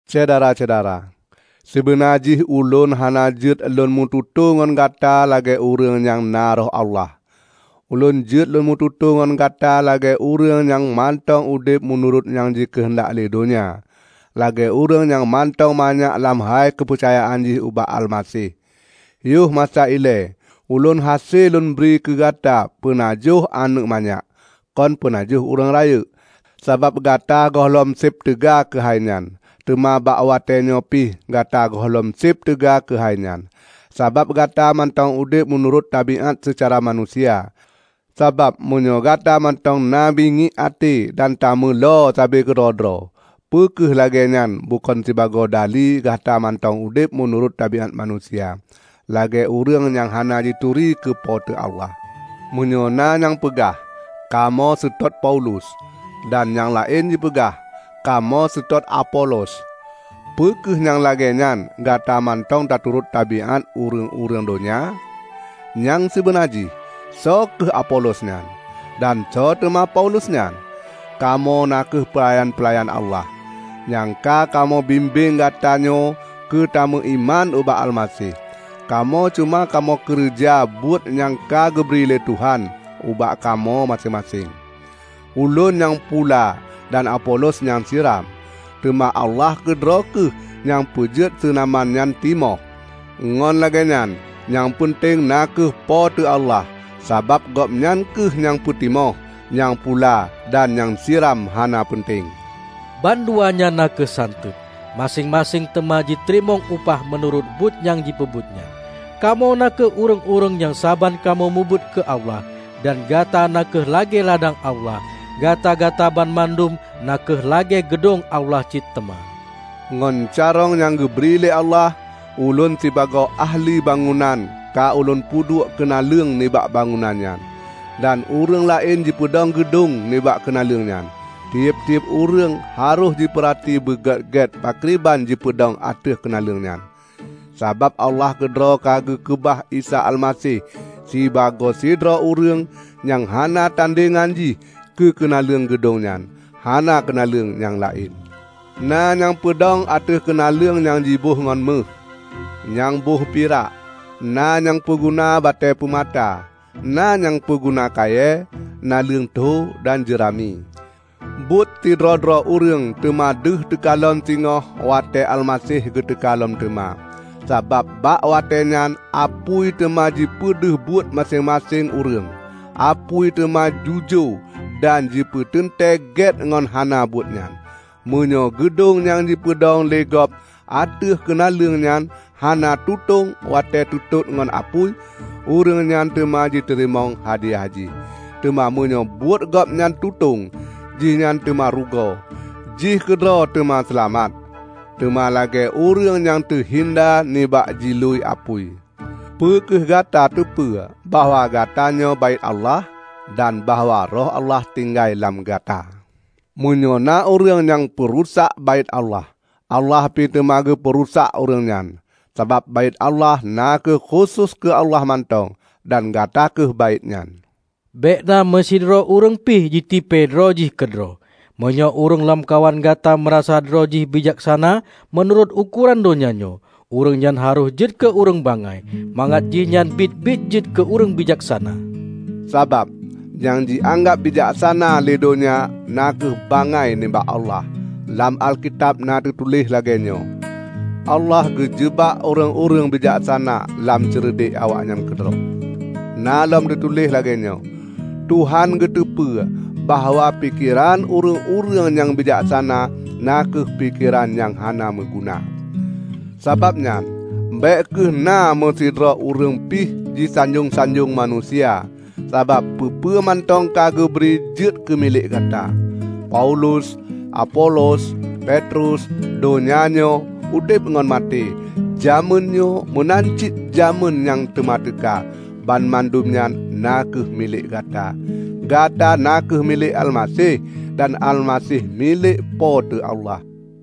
Syedara-syedara, sibeuna jih ulôn hana jeuet lôn meututoe ngon gata lagée ureuëng nyang na Roh Allah. Ulôn jeuet lôn meututoe ngon Gata lagée ureuëng nyang mantong udeb meunurot nyang jikeuheundak lé donya; lagée ureuëng nyang mantong manyak lam hai keupeucayaan jih ubak Almaseh. Yoh masa ilée ulôn hase lôn bri keugata peunajoh aneuëk manyak, kon peunajoh ureuëng rayeuk; sabab gata gohlom seb teuga keuhai nyan. Teuma bak watéenyoe pih gata gohlom seb teuga keuhai nyan, sabab gata mantong udeb meunurot tabiát seucara manusia. Sabab meunyoe gata mantong na bingiek até dan tameulo sabe keudroe-droe, peu kheueh lagée nyan bukon sibagoe dali gata mantong udeb meunurot tabiát manusia, lagée ureuëng nyang hana jituri keu Po teu Allah? Meunyoe na nyang peugah, "Kamoe seutôt Paulus," dan nyang laén jipeugah, "Kamoe seutôt Apolos," peu kheueh nyang lagée nyan gata mantong taturot tabiát ureuëng-ureuëng donya? Nyang sibeuna jih soe kheueh Apolos nyan? Dan soe teuma Paulus nyan? Kamoe na kheueh peulayan-peulayan Allah, nyang ka kamoe bimbeng gatanyoe keu tameuiman ubak Almaseh. Kamoe cuma kamoe keureuja buet nyang ka geubri lé Tuhan ubak kamoe maséng-maséng. Ulôn nyang pula dan Apolos nyang siram, teuma Allah keudroe kheueh nyang peujeuet seunaman nyan timoh. Ngon lagée nyan, nyang peunteng na kheueh Po teu Allah, sabab Gobnyan kheueh nyang peutimoh. Nyang pula dan nyang siram hana peunteng; banduanyan na kheueh santeuet. Maséng-maséng teuma jiteurimong upah meunurot buet nyang jipeubuet nyan. Kamoe na kheueh ureuëng-ureuëng nyang saban kamoe mubuet keu Allah; dan gata na kheueh lagée ladang Allah. Gata-gata banmandum na kheueh lagée geudong Allah cit teuma. Ngon carông nyang geubri lé Allah, ulôn sibagoe ahli bangunan ka ulôn puduek keunaleueng nibak bangunan nyan, dan ureuëng laén jipeudong geudong nibak keunaleueng nyan. Tieb-tieb ureuëng harôh jipeurati beugét-gét pakriban jipeudong ateueh keunaleueng nyan. Sabab Allah keudroe ka geukeubah Isa Almaseh sibagoe sidroe ureuëng nyang hana tandengan jih keu keunaleueng geudong nyan; hana keunaleueng nyang laén. Na nyang peudong ateueh keunaleueng nyang jiboh ngon méuh, nyang boh pirak, na nyang peuguna batée peumata, na nyang peuguna kayée, naleueng tho dan jeurami. Buet sidroe-droe ureuëng teuma deuh teukalon singoh watée Almaseh geuteuka lom teuma. Sabab bak watée nyan apui teuma jipeudeuh buet maséng-maséng ureuëng. Apui teuma jiujoe dan jipeuteuntée gét ngon hana buet nyan. Meunyoe geudong nyang jipeudong lé gob ateueh keunaleueng nyan hana tutong watée teutot ngon apui, ureuëng nyan teuma jiteurimong hadiah jih. Teuma meunyoe buet gob nyan tutong, jihnyan teuma rugoe; jih keudroe teuma seulamat, teuma lagée ureuëng nyang teuhinda nibak jilui apui. Peu kheueh Gata teupeu bahwa gatanyoe Baét Allah? Dan bahwa Roh Allah tinggai lam gata? Meunyoe na ureuëng nyang jipeurusak Baét Allah, Allah pih teuma geupeu rusak ureuëng nyan. Sabab Baét Allah na kheueh khusos keu Allah mantong, dan gata kheueh baét nyan. Bék na meusidroe ureuëng pih jitipée droe jih keudroe. Meunyoe ureuëng lamkawan gata meurasa droe jih bijaksana meunurot ukoran donya nyoe, ureuëng nyan harôh jeuet keu ureuëng bangai, mangat jihnyan biet-biet jeuet keu ureuëng bijaksana. Sabab, nyang jianggab bijaksana lé donya na kheueh bangai nibak Allah. Lam Alkitab na teutuléh lagée nyoe, "Allah geujeubak ureuëng-ureuëng bijaksana lam ceureudek awaknyan keudroe." Na lom teutuléh lagée nyoe, "Tuhan geuteupeue bahwa pikeran ureuëng-ureuëng nyang bijaksana na kheueh pikeran nyang hana meuguna." Sabab nyan, bék kheueh na meusidroe ureuëng pih jisanjong-sanjong manusia, sabab peue-peue mantong ka geubri jeuet keumilék gata: Paulus, Apolos, Petrus, donya nyoe, udeb ngon maté, jamén nyoe meunan cit jamén nyang teuma teuka, banmandum nyan na kheueh milék gata. Gata na kheueh milék Almaseh, dan Almaseh milék Po teu Allah.